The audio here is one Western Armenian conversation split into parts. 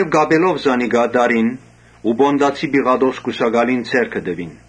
Կապելով զանիկա տարին Պոնտացի Պիղատոս կուսակալին ձեռքը տուին։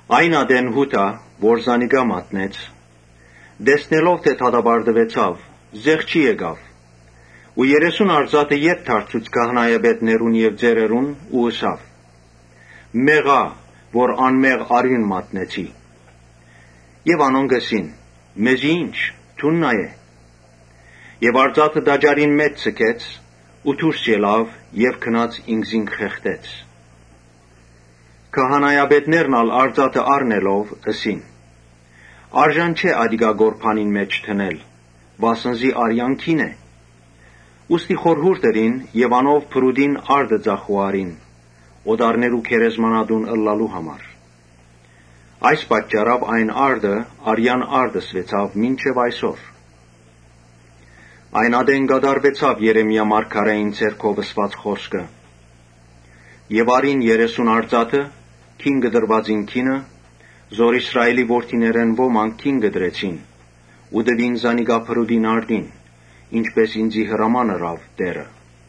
Այն ատեն Յուդա, որ զանիկա մատնեց, տեսնելով որ դատապարտուեցաւ, զղջաց ու երեսուն արծաթը ետ դարձուց քահանայապետներուն եւ ծերերուն Ու ըսաւ. «Մեղա՜յ, անմեղ արիւն մատնեցի»։ Անոնք ըսին. «Մեզի ի՞նչ, դուն նայէ»։ Դրամը գանձանակին մէջ ձգեց ու դուրս ելաւ եւ գնաց ինքզինքը խեղդեց։ Քահանայապետներն ալ արծաթը առնելով՝ ըսին. «Արժան չէ ատիկա Այսինքն, տաճարինկորբանին մէջ՝ ՝ դնել, վասն զի արեան գին է»։ Ուստի խորհուրդ ըրին եւ անով բրուտին արտը ծախու առին՝ օտարներու գերեզմանատուն ըլլալու համար։ Այս պատճառաւ այն արտը «Արեան արտ» կոչուեցաւ մինչեւ այսօր։ Այն ատեն կատարուեցաւ Ոմանք, չունին ԵրեմիաԵրեմիա մարգարէին միջոցով ըսուած խօսքը. «Եւ առին երեսուն արծաթը, գին կտրուածին գինը, որ Իսրայէլի որդիներէն ոմանք գին կտրեցին, Ու տուին զանիկա բրուտին արտին, ինչպէս ինծի հրաման ըրաւ Տէրը»։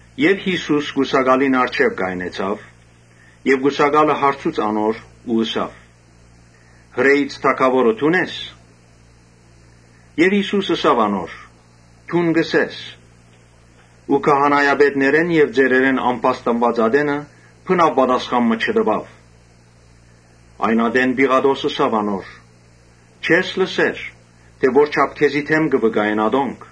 Յիսուս կուսակալին առջեւ կայնեցաւ. եւ կուսակալը հարցուց անոր ու ըսաւ. «Հրէից թագաւորը դո՞ւն ես»։ Եւ Յիսուս ըսաւ անոր. «Դուն կ’ըսես»։ Բայց քահանայապետներէն եւ ծերերէն ամբաստանուած ատենը բնաւ պատասխան մը չտուաւ։ Այն ատեն Պիղատոս ըսաւ անոր. «Չե՞ս լսեր թէ ո՛րչափ քեզի դէմ կը վկայեն ատոնք»։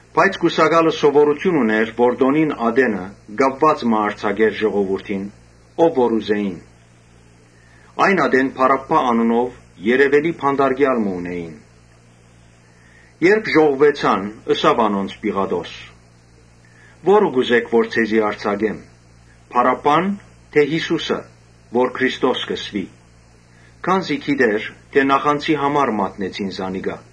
Բայց կուսակալը սովորութիւն ունէր տօնին ատենը կապուած մը արձակելու ժողովուրդին, ով որ ուզէին։ Այն ատեն Բարաբբա անունով երեւելի բանտարկեալ մը ունէին։ Երբ ժողվուեցան, ըսաւ անոնց Պիղատոս. «Ո՞րը կ’ուզէք որ ձեզի արձակեմ. Բարաբբա՞ն, թէ Յիսուսը՝ որ Քրիստոս կ’ըսուի». Քանզի գիտէր թէ նախանձի համար մատնեցին զանիկա։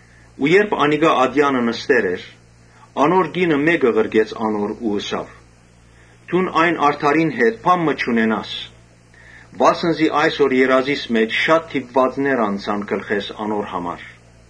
Երբ անիկա ատեանը նստեր էր, անոր կինը մէկը ղրկեց անոր ու ըսաւ. «Դուն այն արդարին հետ գործ մի ունենար, վասն զի այսօր երազիս մէջ շատ դիպուածներ անցան գլխէս անոր համար»։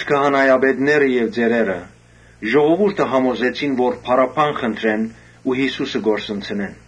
Քահանայապետները եւ ծերերը ժողովուրդը համոզեցին որ Բարաբբան խնդրեն ու Յիսուսը կորսնցնեն։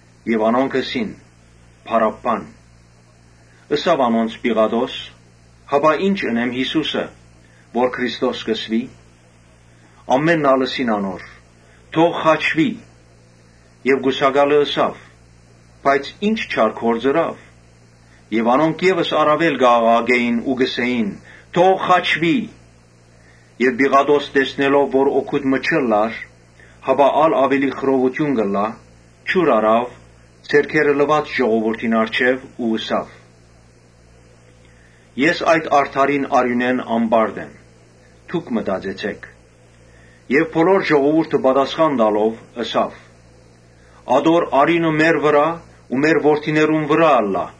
Անոնք ըսին. «Բարաբբան»։ Ըսաւ անոնց Պիղատոս. «Հապա ի՞նչ ընեմ Յիսուսը, որ Քրիստոս կ’ըսուի»։ Ամէնքն ալ ըսին անոր. «Թող խաչուի»։ Եւ կուսակալը ըսաւ. «Բայց ի՞նչ չար գործ ըրաւ»։ Անոնք ա՛լ աւելի կ’աղաղակէին ու կ’ըսէին. «Թող խաչուի»։ Պիղատոս տեսնելով որ օգուտ մը չունի, հապա ա՛լ աւելի խռովութիւն կ’ըլլայ, ջուր առաւ, ձեռքերը լուաց ժողովուրդին առջեւ ու ըսաւ. «Ես այդ արդարին արիւնէն անպարտ եմ. դո՛ւք մտածեցէք»։ Բոլոր ժողովուրդը պատասխան տալով՝ ըսաւ. «Ատոր արիւնը մեր վրայ ու մեր որդիներուն վրայ ըլլայ»։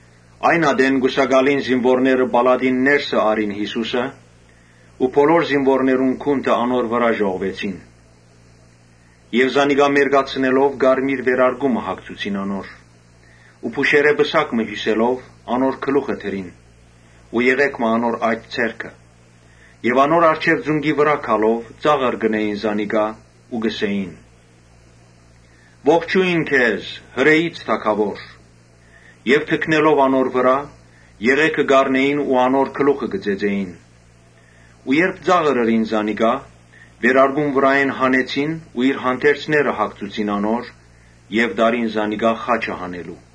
Այն ատեն կուսակալին զինուորները պալատէն ներս առին Յիսուսը ու բոլոր զինուորներուն գունդը անոր վրայ ժողվեցին. Զանիկա մերկացնելով կարմիր վերարկու մը հագցուցին անոր, Ու փուշերէ պսակ մը հիւսելով՝ անոր գլուխը դրին ու եղէգ մը անոր աջ ձեռքը եւ անոր առջեւ ծունկի վրայ գալով կը ծաղրէին զանիկա ու կ’ըսէին. «Ողջո՜յն քեզ, Հրէից թագաւոր»։ Եւ թքնելով անոր վրայ՝ եղէգը կ’առնէին ու անոր գլխուն կը զարնէին։ Շարունակեցին ծաղրել զանիկա, վերարկուն վրայէն հանեցին ու իր հանդերձները հագցուցին անոր եւ տարին զանիկա խաչը հանելու։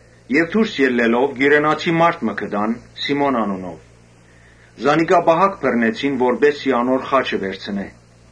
Դուրս ելլելով, Կիւրենացի մարդ մը գտան Սիմոն անունով, զանիկա պահակ բռնեցին որպէս զի անոր խաչը վերցնէ։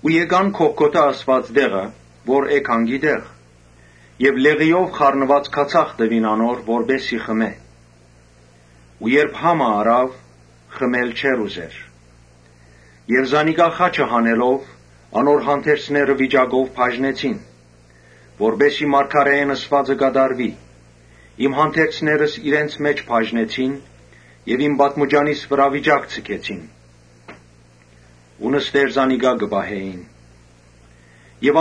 Եկան Գողգոթա ըսուած տեղը, որ է գանկի տեղ։ Լեղիով խառնուած քացախ տուին անոր, որպէս զի խմէ։ Երբ համը առաւ, խմել չուզեց։ Զանիկա խաչը հանեցին եւ անոր հանդերձները վիճակով բաժնեցին. [որպէս զի մարգարէէն ըսուածը կատարուի, «Իմ հանդերձներս իրենց մէջ բաժնեցին եւ իմ պատմուճանիս վրայ վիճակ ձգեցին»]։ Անոնք նստեր զանիկա կը պահէին։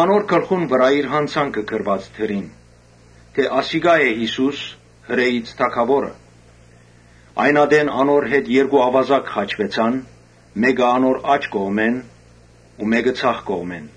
Անոր գլխուն վրայ իր յանցանքը գրուած դրին, թէ ‘Ասիկա է Յիսուս, Հրէից թագաւորը’։ Այն ատեն անոր հետ երկու աւազակ խաչուեցան, մէկը անոր աջ կողմը ու մէկը ձախ կողմը։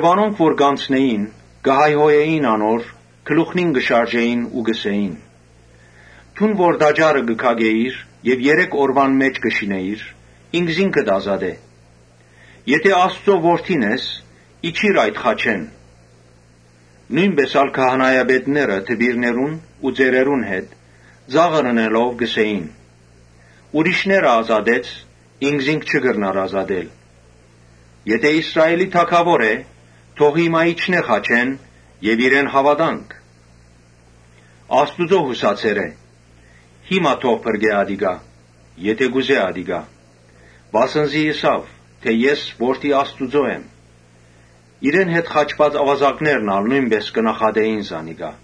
Անոնք որ կ’անցնէին՝ կը հայհոյէին անոր, գլուխնին կը շարժէին, Ու կ’ըսէին. «Դուն որ տաճարը կը քակէիր եւ երեք օրուան մէջ կը շինէիր, ինքզինքդ ազատէ։ Եթէ Աստուծոյ Որդին ես, իջիր այդ խաչէն»։ Նոյնպէս ալ քահանայապետները դպիրներուն ու ծերերուն հետ ծաղրելով՝ կ’ըսէին. «Ուրիշները ազատեց, ինքզինք չի կրնար ազատել։ Եթէ Իսրայէլի թագաւոր է, թող հիմա իջնէ խաչէն եւ իրեն հաւատանք։ Աստուծոյ յուսացեր է, հիմա թող փրկէ ատիկա՝ եթէ կ’ուզէ։ Վասն զի ըսաւ, թէ ‘Ես Որդի Աստուծոյ եմ’»։ Իրեն հետ խաչուած աւազակներն ալ նոյնպէս կը նախատէին զանիկա։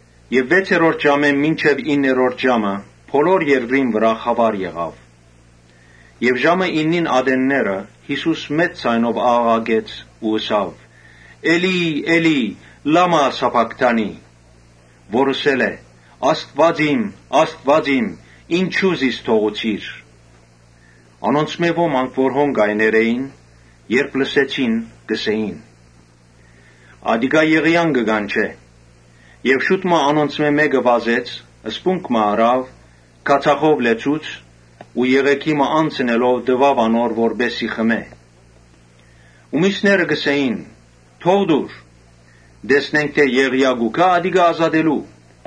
Վեցերորդ ժամէն մինչեւ իններորդ ժամը բոլոր երկրին վրայ խաւար եղաւ։ Ժամը իննին ատենները Յիսուս մեծ ձայնով աղաղակեց ու ըսաւ. «Էլի՜, Էլի՜, լա՞մա սաբաքթանի». որ ըսել է՝ «Աստուա՜ծ իմ, Աստուա՜ծ իմ, ինչո՞ւ զիս թողուցիր». Անոնցմէ ոմանք որ հոն կայներ էին, երբ լսեցին՝ ըսին. «Ատիկա Եղիան կը կանչէ»։ Շուտ մը անոնցմէ մէկը վազեց սպունգ մը առաւ՝ քացախով լեցուց ու եղէգի մը անցընելով տուաւ անոր որպէս զի խմէ։ Միւսները ըսին. «Թո՛ղ տուր, տեսնենք թէ Եղիան պիտի գա՞յ ատիկա ազատելու»։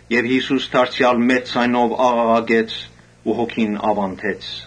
Յիսուս դարձեալ մեծ ձայնով աղաղակեց ու հոգին աւանդեց։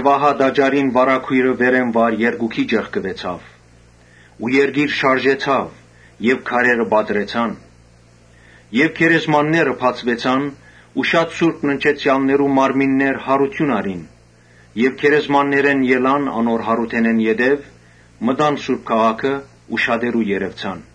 Ահա տաճարին վարագոյրը վերէն վար երկուքի ճեղքուեցաւ, երկիր շարժեցաւ, քարերը պատռեցան, Գերեզմանները բացուեցան ու շատ մը սուրբ ննջեցեալներու մարմիններ յարութիւն առին։ Եւ գերեզմաններէն ելան անոր յարութենէն յետոյ, մտան սուրբ քաղաքը ու շատերու երեւցան։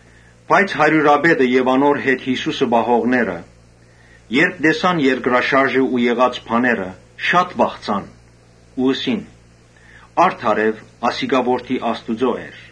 Բայց հարիւրապետը եւ անոր հետ Յիսուսը պահողները, երբ տեսան երկրաշարժը ու եղած բաները, շատ վախցան ու ըսին. «Արդարեւ ասիկա Որդի Աստուծոյ էր»։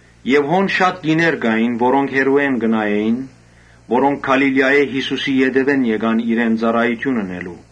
Հոն շատ կիներ կային, որոնք հեռուէն կը նայէին, որոնք Գալիլիայէն Յիսուսին ետեւէն եկան իրեն ծառայութիւն ընելու։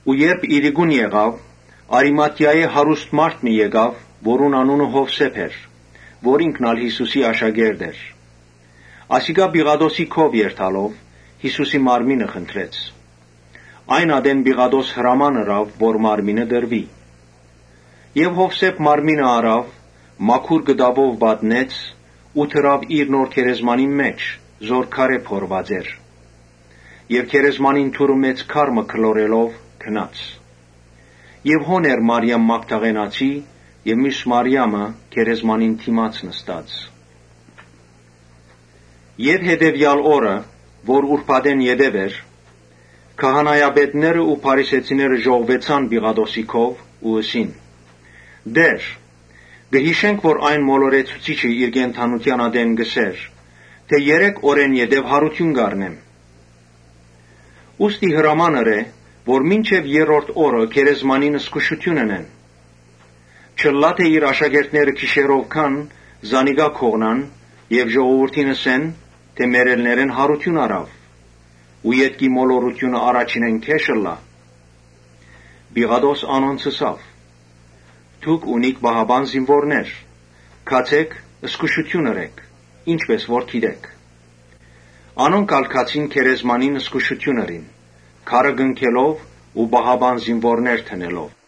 Երբ իրիկուն եղաւ, Արիմաթիայէն հարուստ մարդ մը եկաւ, որուն անունը Յովսէփ էր, որ ինքն ալ Յիսուսի աշակերտ էր։ Ասիկա Պիղատոսին քով երթալով՝ Յիսուսին մարմինը խնդրեց. այն ատեն Պիղատոս հրաման ըրաւ որ մարմինը տրուի։ Յովսէփ մարմինը առաւ, մաքուր կտաւով փաթթեց, Ու դրաւ իր նոր գերեզմանին մէջ՝ որ քարէ փորուած էր եւ գերեզմանին դուռը մեծ քար մը գլորելով՝ գնաց։ Հոն Մարիամ Մագդաղենացին եւ միւս Մարիամը՝ գերեզմանին դիմաց նստած էին։ Հետեւեալ օրը, որ ուրբաթէն յետոյ էր, քահանայապետներն ու փարիսեցիները ժողվուեցան Պիղատոսին քով Ու ըսին. «Տէ՛ր, կը յիշենք թէ այն մոլորեցուցիչը իր կենդանութեան ատեն կ’ըսէր թէ՝ ‘Երեք օրէն յետոյ յարութիւն պիտի առնեմ’, Ուստի հրաման ըրէ, որ մինչեւ երրորդ օրը գերեզմանին զգուշութիւն ընեն։ Չըլլայ թէ իր աշակերտները գիշերով գան զանիկա գողնան եւ ժողովուրդին ըսեն թէ՝ ‘Մեռելներէն յարութիւն առաւ’. ու ետքի մոլորութիւնը առաջինէն գէշ ըլլայ»։ Պիղատոս անոնց ըսաւ. «Դուք ունիք պահապան զինուորներ. գացէ՛ք, զգուշութիւն ըրէք, ինչպէս որ կ’ուզէք»։ Անոնք ալ գացին գերեզմանին զգուշութիւն ըրին, քարը կնքելով ու պահապան զինուորներ դնելով։